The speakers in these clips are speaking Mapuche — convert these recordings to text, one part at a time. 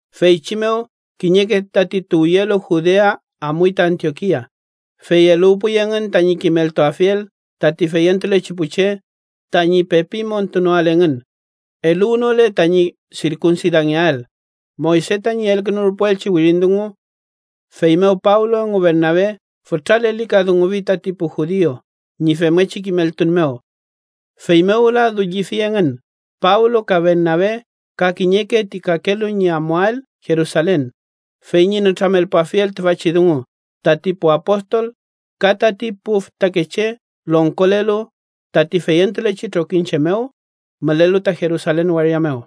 Feychi mew, kiñeke tati tuwyelu Judea amuy ta Antiokia, fey eluwpuy engün tañi kimeltuafiel tati feyentulechi pu che tañi pepi montunoael engün, eluwnole tañi sirkunsidangeael, Moyse tañi elkünurpuelchi wirin dungu. Feymew Pablo engu Bernabe fütra lelikadungufi tati pu judiu ñi femngechi kimeltun mew. Feymew wüla dullifi engün Pablo ka Bernabe ka kiñeke ti kakelu ñi amuael Jerusalen fey ñi nütramelpuafiel tüfachi dungu tati pu apostol ka tati pu fütakeche longkolelu tati feyentulechi trokiñche mew mülelu ta Jerusalen waria mew.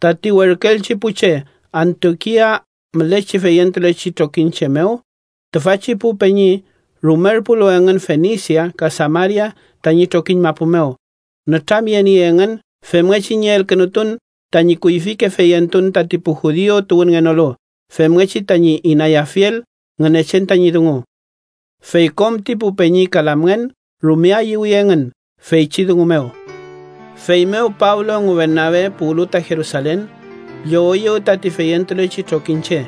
Tati werküelchi pu che Antiokia mülechi feyentulechi trokiñche mew, tüfachi pu peñi rumerpulu engün Fenisia ka Samaria tañi trokiñ mapu mew, nütramyeniey engün femngechi ñi elkünutun tañi kuyfike feyentun tati pu judiu tuwünngenolu femngechi tañi inayafiel Ngünechen tañi dungu. Fey kom ti pu peñi ka lamngen rume ayüwi engün feychi dungu mew. Feymew Pablo engu Bernabe puwlu ta Jerusalen, lloweyew tati feyentulechi trokiñche,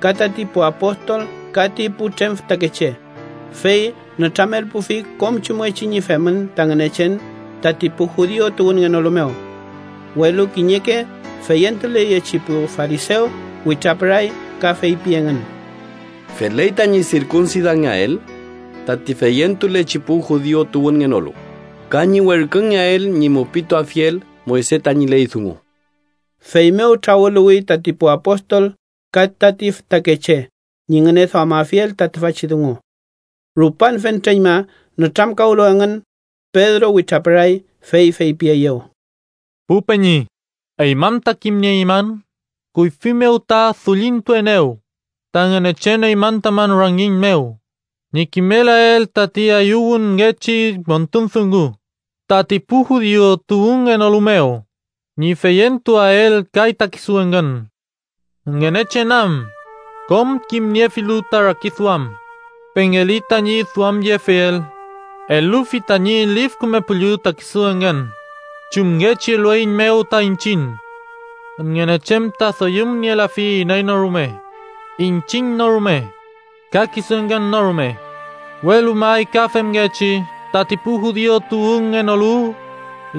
ka tati pu apostol ka ti putrem fütakeche, fey nütramelpufi kom chumngechi ñi femün ta Ngünechen tati pu judiu tuwünngenolu mew. Welu kiñeke feyentuleyechi pu farisew witrapüray ka feypi engün: —Feley tañi sirkunsidangeael tati feyentulechi pu judiu tuwünngenolu, ka ñi werküngeael ñi mupituafiel Moyse tañi ley dungu. Feymew trawüluwi tati pu apostol ka tati fütakeche ñi ngüneduamafiel ta tüfachi dungu. Rupan fentreñma nütramkawlu engün, Pedro witrapüray fey feypieyew: —Pu peñi, eymün ta kimnieymün kuyfi mew ta dullintuenew ta Ngünechen eymün tamün rangiñ mew ñi kimelael tati ayüwünngechi montun dungu tati pu judiu tuwünngenolu mew, ñi feyentuael kay ta kisu engün. Ngünechen am, kom kimniefilu ta rakiduam, pengeli tañi duamyefiel. Elufi tañi Lif Küme Püllü ta kisu engün, chumngechi elueiñmew ta iñchiñ. Ngünechen ta doyümnielafi iney no rume, iñchiñ no rume, ka kisu engün no rume, welu may ka femngechi tati pu judiu tuwünngenolu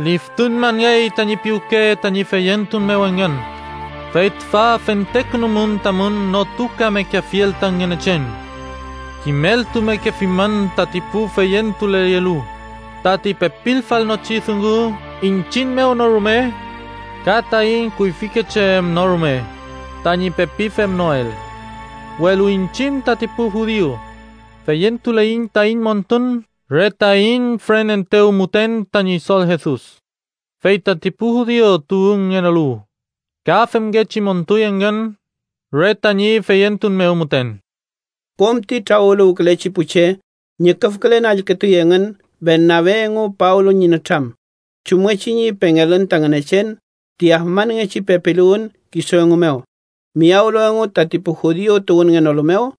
liftuñmangey tañi piwke tañi feyentun mew engün. Fey tüfa fentekünumün tamün notukamekeafiel ta Ngünechen. Kimeltumekefimün tati pu feyentuleyelu tati pepilfalnochi dungu iñchiñ no rume ka taiñ kuyfike che em no rume tañi pepi femnoel. Welu iñchiñ tati pu judiu, feyentuleiñ taiñ montun re taiñ füreneetew mew müten ta Ñidol Jesus, fey tati pu judiu tuwünngenolu ka femngechi montuy engün re tañi feyentun mew müten. Kom ti trawüluwkülechi pu che ñüküfkülen allkütuy engün Bernabe engu Pablo ñi nütram, chumngechi ñi pengelün ta Ngünechen ti afmanngechi pepiluwün kisu engu mew, miyawlu engu tati pu judiu tuwünngenolu mew.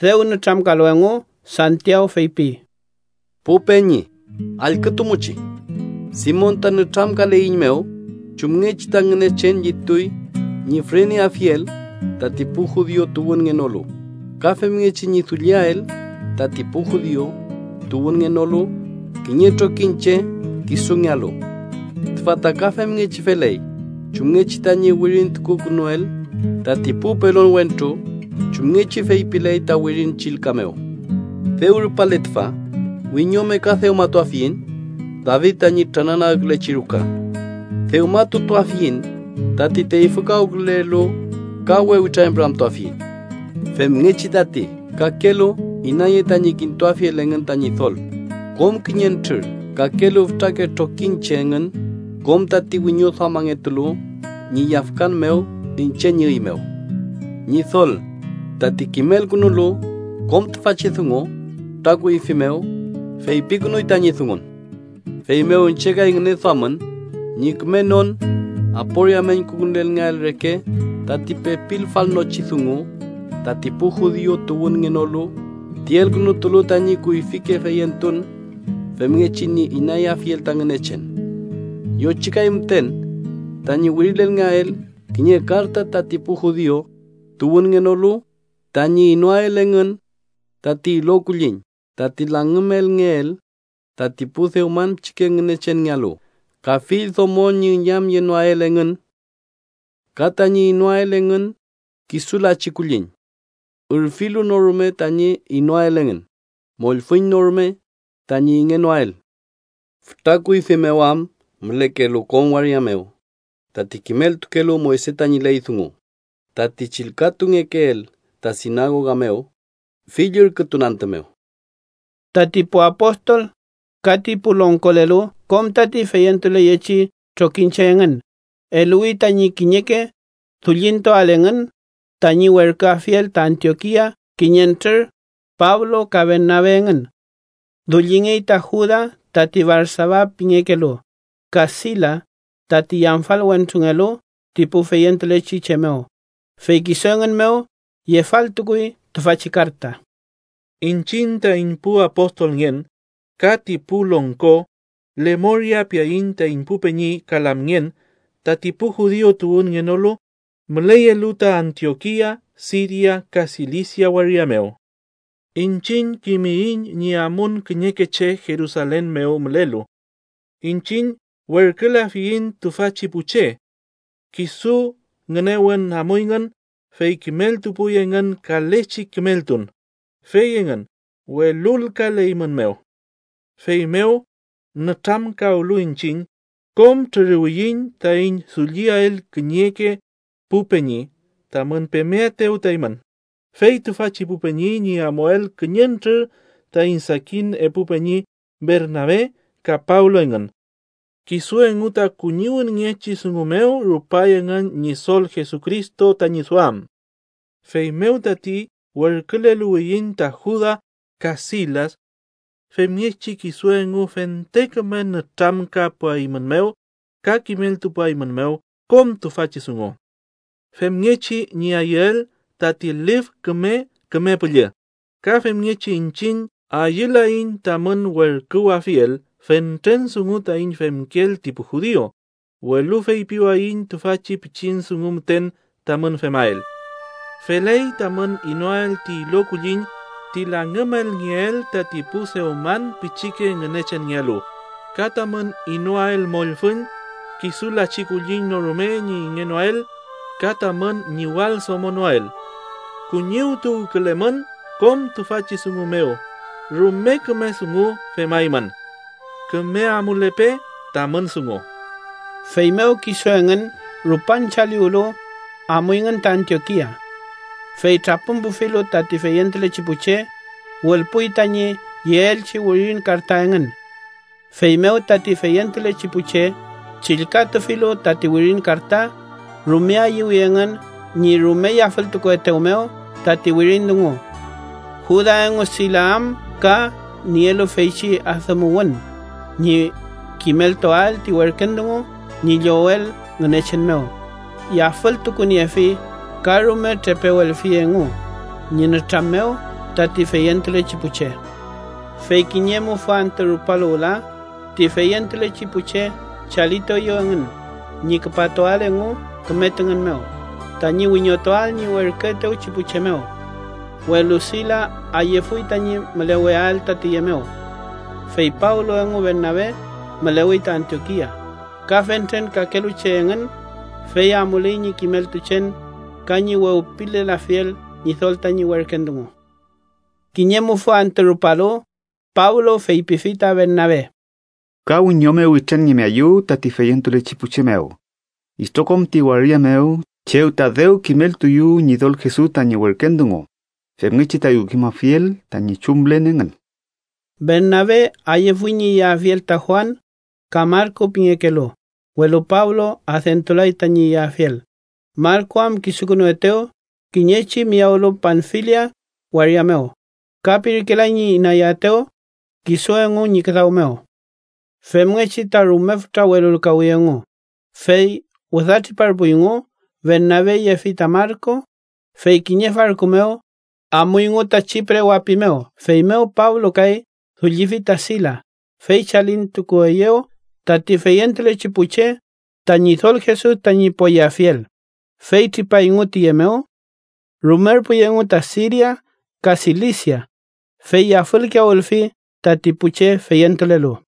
Dew nütramkalu engu, Santiaw feypi: —Pu peñi, allkütumuchi: Simon ta nütramkaleiñmew chumngechi ta Ngünechen llituy ñi füreneafiel tati pu judiu tuwünngenolu, ka femngechi ñi dulliael tati pu judiu tuwünngenolu kiñe trokiñche kisungealu. Tüfa ta ka femngechi feley chumngechi tañi wirintukukünuel tati pu pelon wentru, chumngechi feypiley ta Wirin Chillka mew: ‘Dew rupale tüfa, wiñome ka dewmatuafiñ David tañi trananagkülechi ruka. Dewmatutuafiñ tati teyfükawkülelu ka we witrañpüramtuafiñ, femngechi tati kakelu inaye tañi kintuafiel engün ta Ñidol kom kiñentrür kakelu fütrake trokiñche engün kom tati wiñoduamangetulu ñi yafkan mew iñche ñi üy mew.’ Ñidol tati kimelkünulu kom tüfachi dungu fütra kuyfi mew, feypikünuy tañi dungun. “Feymew iñche kay ngüneduamün, ñi kümenon aporia meñkukünulngeael reke tati pepilfalnochi dungu tati pu judiu tuwünngenolu ti elkünutulu tañi kuyfike feyentun femngechi ñi inayafiel ta Ngünechen. Yochikay müten tañi wirilelngeael kiñe karta tati pu judiu tuwünngenolu tañi inoael engün tati ilo kulliñ tati langümelngeel tati pu dewman pichike ngünechenngealu, ka fill domo ñi üñamyenoael engün ka tañi inoael engün kisu lachi kulliñ, ürfilu no rume tañi inoael engün, mollfüñ no rume tañi ingenoael. Fütra kuyfi mew am mülekelu kom waria mew tati kimeltukelu Moyse tañi ley dungu, tati chillkatungekeel ta sinagoga mew fill ürkütun antü mew.” Tati pu apostol ka ti pu longkolelu, kom tati feyentuleyechi trokiñche engün, eluwi tañi kiñeke dullintuael engün tañi werküafiel ta Antiokia kiñentrür Pablo ka Bernabe engün. Dullingey ta Juda tati Barsaba pingekelu, ka Silas, tati yamfal wentrungelu ti pu feyentulechi che mew, fey kisu engün mew yefaltukuy tüfachi karta: Iñchiñ taiñ pu apostolngen ka ti pu longko, lemoria piaiñ taiñ pu peñi ka lamngen, tati pu judiu tuwünngenolu müleyelu ta Antiokia, Siria ka Silisia waria mew: Iñchiñ kimiyiñ ñi amun kiñeke che Jerusalen mew mülelu. Iñchiñ werkülafiyiñ tüfachi pu che. Kisu ngünewün amuyngün, fey kimeltupuy engün kalechi kimeltun, fey engün welulkaleymünmew. Feymew, nütramkawlu iñchiñ, kom trüruwiyiñ taiñ dulliael kiñeke pu peñi, tamün pemeaetew ta eymün, fey tüfachi pu peñi ñi amuael kiñentrür taiñ sakin epu peñi Bernabe ka Pablo engün. Kisu engu ta kuñiwünngechi dungu mew rupay engün Ñidol Jesucristo tañi duam. Feymew tati werküleluwiyiñ ta Juda ka Silas. Femngechi kisu engu fente küme nütramkapuaeymünmew ka kimeltupuaeymünmew kom tüfachi dungu. Femngechi ñi ayüel tati Lif Küme Küme Püllü, ka femngechi iñchiñ ayülaiñ tamün werküwafiel fentren dungu taiñ femkeel ti pu judiu, welu feypiwayiñ tüfachi pichin dungu müten tamün femael: Feley tamün inoael ti ilo kulliñ ti langümelngeel tati pu dewman pichike ngünechenngealu, ka tamün inoael mollfüñ, kisu lachi kulliñ no rume ñi ingenoael ka tamün ñiwaldomonoael. Kuñiwtuwkülelmün kom tüfachi dungu mew, rume küme dungu femaymün. Küme amulepe tamün dungu. Feymew kisu engün rupan chaliwlu, amuyngün ta Antiokia. Fey trapümpufilu tati feyentulechi pu che, wülpuy tañi yeelchi wirin karta engün. Feymew tati feyentulechi pu che chillkatufilu tati wirin karta, rume ayüwi engün ñi rume yafültukuetew mew tati wirin dungu. Juda engu Silas am ka nielu feychi adümuwün ñi kimeltuael ti werken dungu ñi llowel Ngünechen mew, yafültukuniefi ka rume trepewelfi engu ñi nütram mew tati feyentulechi pu che. Fey kiñe mufü antü rupalu wüla, ti feyentulechi pu che chalitueyew engün ñi küpatuael engu küme tüngün mew, tañi wiñotuael ñi werküetewchi pu che mew. Welu Silas ayüfuy tañi müleweael ta tüye mew. Fey Pablo engu Bernabe mülewey ta Antiokia, ka fentren kakelu che engün, fey amuley ñi kimeltuchen ka ñi wewpilelafiel Ñidol tañi werken dungu. Kiñe mufü antü rupalu, Pablo feypifi ta Bernabe: —Ka wiñome witranngemeayu tati feyentulechi pu che mew itrokom ti waria mew chew ta dew kimeltuyu Ñidol Jesus tañi werken dungu, femngechi tayu kimafiel tañi chumlen engün. Bernabe ayüfuy ñi yeafiel ta Juan, ka Marku pingekelu, welu Pablo adentulay tañi yeafiel, Marku am kisukünuetew kiñechi miyawlu Panfilia waria mew, ka pirkelay ñi inayaetew kisu engu ñi küdaw mew. Femngechi ta rume fütra welulkawi engu, fey wüda triparpuyngu. Bernabe yefi ta Marku, fey kiñe farku mew amuyngu ta Chipre wapi mew. Feymew, Pablo kay, dullifi ta Silas, fey chalintukueyew tati feyentulechi pu che ta Ñidol Jesus tañi poyeafiel, fey tripayngu tiye mew. Rumerpuy engu ta Siria ka Silisia, fey yafülkiyawülfi tati pu che feyentulelu.